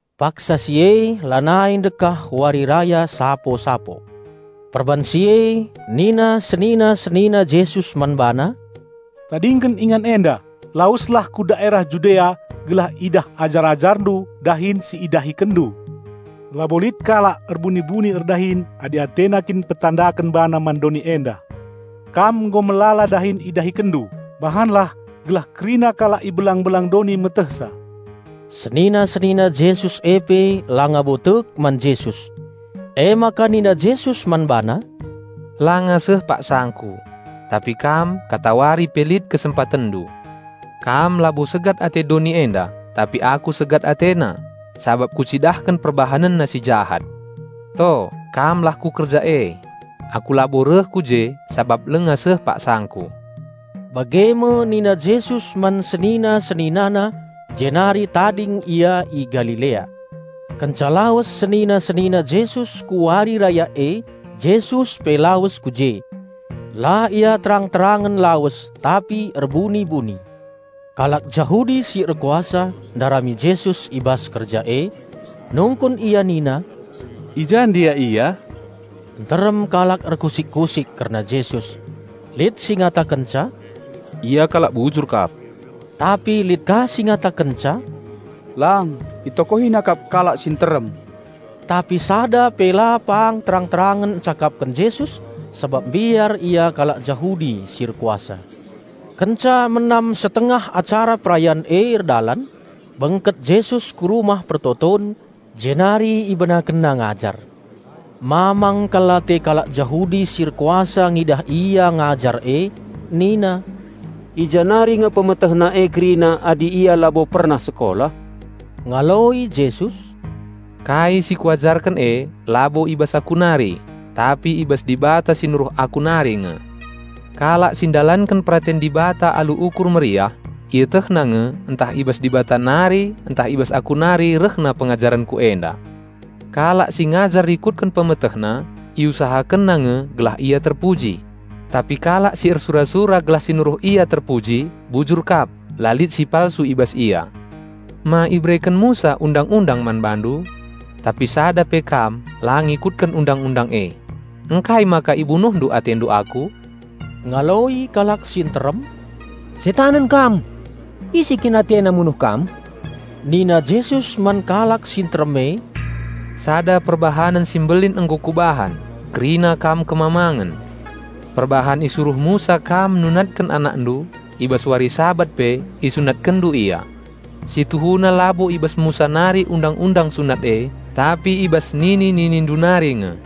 Paksa si e lanai ndekah Wari Raya Barung-barung. Perbahan si e nina senina-senina Jesus man BaNa, "Tadingken ingan enda, laweslah ku daerah Judea gelah idah ajar-AjarNdu dahin si IdahikenNdu. Labo lit kalak erbuni-buni erdahin adi atena kin mpetandaken bana man doni enda. Kam nggo melala dahin IdahikenNdu, bahanlah gelah kerina kalak i belang-belang doni metehsa." (Senina-senina Jesus e pe langa bo tek man Jesus.) Emaka nina Jesus man bana, "Langa seh paksangKu. Tapi kam katawari pe lit kesempatenndu. Kam labo segat ate doni enda, tapi Aku segat atena, sabap Kucidahken perbahanenna si jahat. To, kam lah ku kerja e. Aku labo reh ku je sabap langa seh paksangKu." Bage me nina Jesus man senina-SeninaNa, jenari tading Ia i Galilea. Kenca lawes senina-senina Jesus ku wari raya e, Jesus pe lawes ku je. La Ia terang-terangen lawes, tapi erbuni-buni. Kalak Jahudi si erkuasa ndarami Jesus i bas kerja e. Nungkun ia nina, "I ja ndia Ia?" Nterem kalak erkusik-kusik kerna Jesus. Lit si ngatakenca, "Ia kalak bujur kap." Tapi lit ka si ngatakenca, "Lang! Itokohina kap kalak si nterem!" Tapi sada pe la pang terang-terangen encakapken Jesus sabap mbiar ia kalak Jahudi si erkuasa. Kenca menam setengah acara perayan e erdalan, bengket Jesus ku Rumah Pertoton, jenari IbenakenNa ngajar. Mamang kal ate kalak Jahudi si erkuasa ngidah Ia ngajar e. Nina, "I ja nari nge PemetehNa e kerina adi Ia labo pernah sekolah?" Ngaloi Jesus, "Kai si Kuajarken e labo i bas Aku nari, tapi i bas Dibata si nuruh Aku nari nge. Kalak si ndalanken peraten Dibata alu ukur meriah, ietehna nge ntah i bas Dibata nari ntah i bas Aku nari rehna pengajarenKu enda. Kalak si ngajar rikutken pemetehna, iusahakenna nge gelah ia terpuji. Tapi kalak si ersura-sura gelah si nuruh ia terpuji, bujur kap, la lit si palsu i bas ia. Ma ibereken Musa Undang-undang man bandu? Tapi sada pe la kam ngikutken Undang-undang e. Ngkai maka ibunuhndu atendu Aku?" Ngaloi kalak si nterem, "Setanen Kam! Ise kin atena munuh Kam?" Nina Jesus man kalak si nterem e, "Sada perbahanen si mbelin nggo Kubahan, kerina kam kemamangen. Perbahan isuruh Musa kam nunatken anakndu, i bas wari Sabat pe isunatkenndu ia. (Situhuna labo i bas Musa nari Undang-undang sunat e, tapi i bas nini-ninindu nari nge.)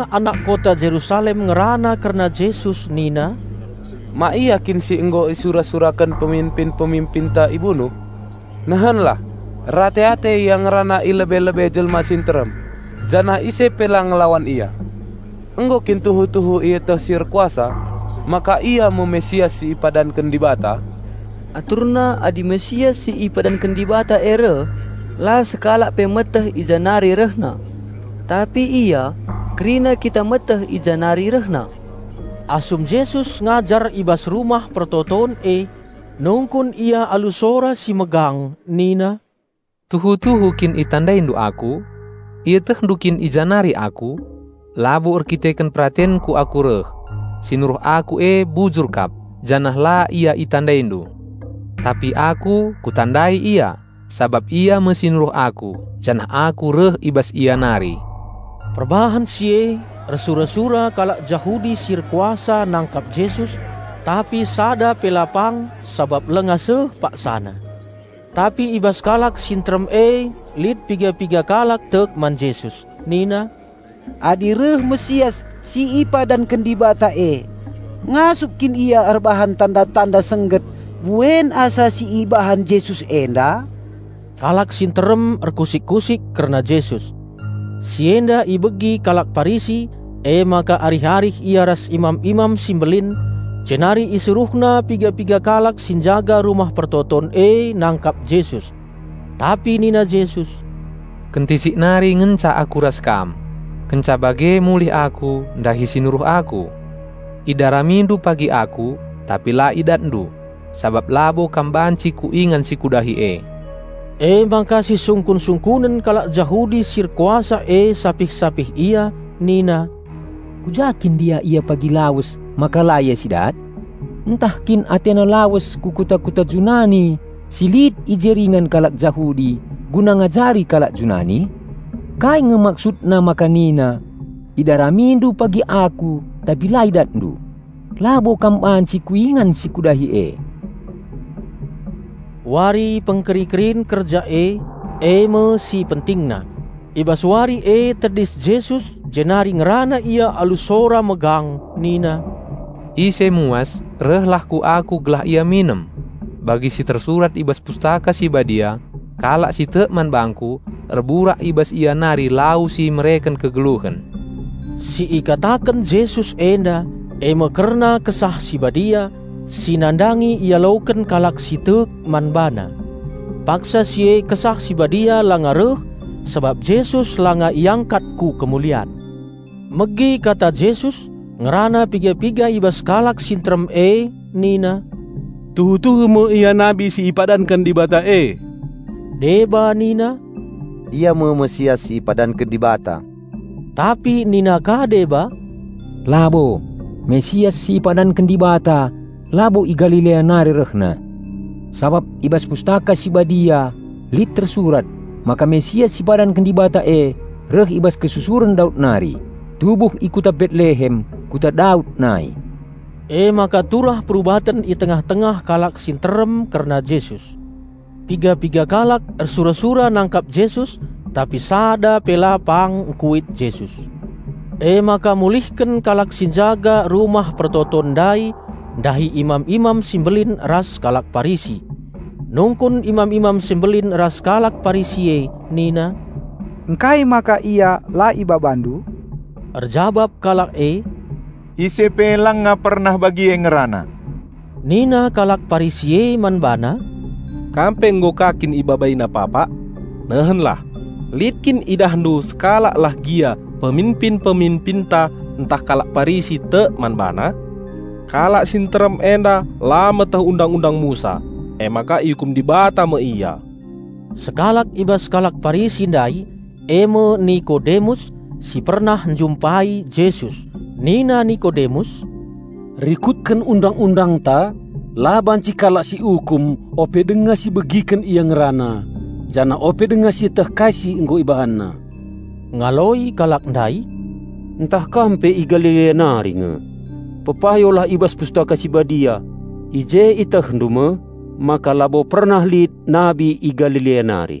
Piga-piga anak kota Jerusalem ngerana kerna Jesus nina, "Ma Ia kin si nggo isura-suraken peminpin-peminpinta ibunuh? Nehenlah! Erate-ate Ia ngerana i lebe-lebe jelma si nterem janah ise pe la ngelawan Ia. Nggo kin tuhu-tuhu ieteh si erkuasa maka Ia me Raja Penampat si ipadanken Dibata? Aturna adi Raja Penampat si ipadanken Dibata e reh, la sekalak pe meteh i ja nari rehna. Tapi Ia, kerina kita meteh i ja nari rehna." Asum Jesus ngajar i bas Rumah Pertoton e, nungkun Ia alu sora si megang nina, "Tuhu-tuhu kin itandaindu Aku? Ietehndu kin i ja nari Aku? Labo erdandanken peratenKu Aku reh. Si nuruh Aku e bujur kap; janah la Ia itandaindu. Tapi Aku, Kutandai Ia, sabap Ia me si nuruh Aku, janah Aku reh i bas Ia nari." Perbahan si e ersura-sura kalak Jahudi si erkuasa nangkap Jesus, tapi sada pe la pang sabap langa seh paksana. Tapi i bas kalak si nterem e lit piga-piga kalak tek man Jesus. Nina, "Adi reh Raja Penampat si ipadanken Dibata e, ngasup kin Ia erbahan tanda-tanda sengget buen asa si ibahan Jesus enda?" Kalak si nterem erkusik-kusik kerna Jesus. Si enda ibegi kalak Parisi, emaka arih-arih ia ras imam-imam si mbelin; jenari isuruhna piga-piga kalak si njaga Rumah Pertoton e nangkap Jesus. Tapi nina Jesus, "Kentisik nari ngenca Aku ras kam. Kenca bage mulih Aku ndahi si nuruh Aku. Idaramindu pagi Aku, tapi la idatndu, sabap labo kam banci ku ingan si Kudahi e." Emaka sisungkun-sungkunen kalak Jahudi si erkuasa e sapih-sapih ia nina, "Ku ja kin ndia Ia pagi lawes maka la Ia si dat? Ntah kin AteNa lawes ku kuta-kuta Junani si lit i je ringan kalak Jahudi guna ngajari kalak Junani? Kai nge maksudna maka nina, 'Idaramindu pagi Aku tapi la idatndu. Labo kam banci ku ingan si Kudahi e?'" Wari pengkeri-kerin kerja e, e me si pentingna. I bas wari e tedis Jesus jenari ngerana Ia alu sora megang nina, "Ise muas rehlah ku Aku gelah ia minem. Bagi si tersurat i bas Pustaka Si Badia, 'Kalak si tek man bangKu, erburak i bas ia nari lau si mereken kegeluhen.'" Si ikataken Jesus enda, e me kerna Kesah Si Badia, si nandangi ialoken kalak si tek man BaNa. Paksa si e Kesah Si Badia langa reh sabap Jesus langa iangkat ku kemulian. Megi kata Jesus, ngerana piga-piga i bas kalak si nterem e nina, "Tuhu-tuhu me Ia nabi si ipadanken Dibata e!" Deba nina, "Ia me Raja Penampat si ipadanken Dibata." Tapi nina ka deba, "Labo! Raja Penampat si ipadanken Dibata labo i Galilea nari rehna. Sabap i bas Pustaka Si Badia lit tersurat maka Raja Penampat si ipadanken Dibata e, reh i bas kesusuren Daud nari, tubuh i kuta Betlehem; Kota Daud nai." Emaka turah perubaten i tengah-tengah kalak si nterem kerna Jesus. Piga-piga kalak ersura-sura nangkap Jesus, tapi sada pe la pang ngkuit Jesus. Emaka mulihken kalak si njaga Rumah Pertoton ndai ndahi imam-imam si mbelin ras kalak Parisi. Nungkun imam-imam si mbelin ras kalak Parisi e nina, "Ngkai maka Ia la ibabandu?" Erjabap kalak e, "Ise pe langa pernah bagi Ia e ngerana!" Nina kalak Parisi e man bana, "Kam pe nggo ka kin IbabaiNa papak? Nehenlah! Lit kin idahndu sekalaklah gia peminpin-peminpinta ntah kalak Parisi tek man BaNa? Kalak si nterem enda la meteh Undang-undang Musa, emaka iukum Dibata me ia!" Sekalak i bas kalak Parisi ndai, e me Nikodemus, si pernah njumpai Jesus. Nina Nikodemus, "Rikutken Undang-undangta la banci kalak siukum ope denga sibegiken ia ngerana janah ope denga sieteh kai si nggo ibahanna." Ngaloi kalak ndai, "Ntah kam pe i Galilea nari nge! Pepayolah i bas Pustaka Si Badia. I je ietehndu me maka labo pernah lit nabi i Galilea nari."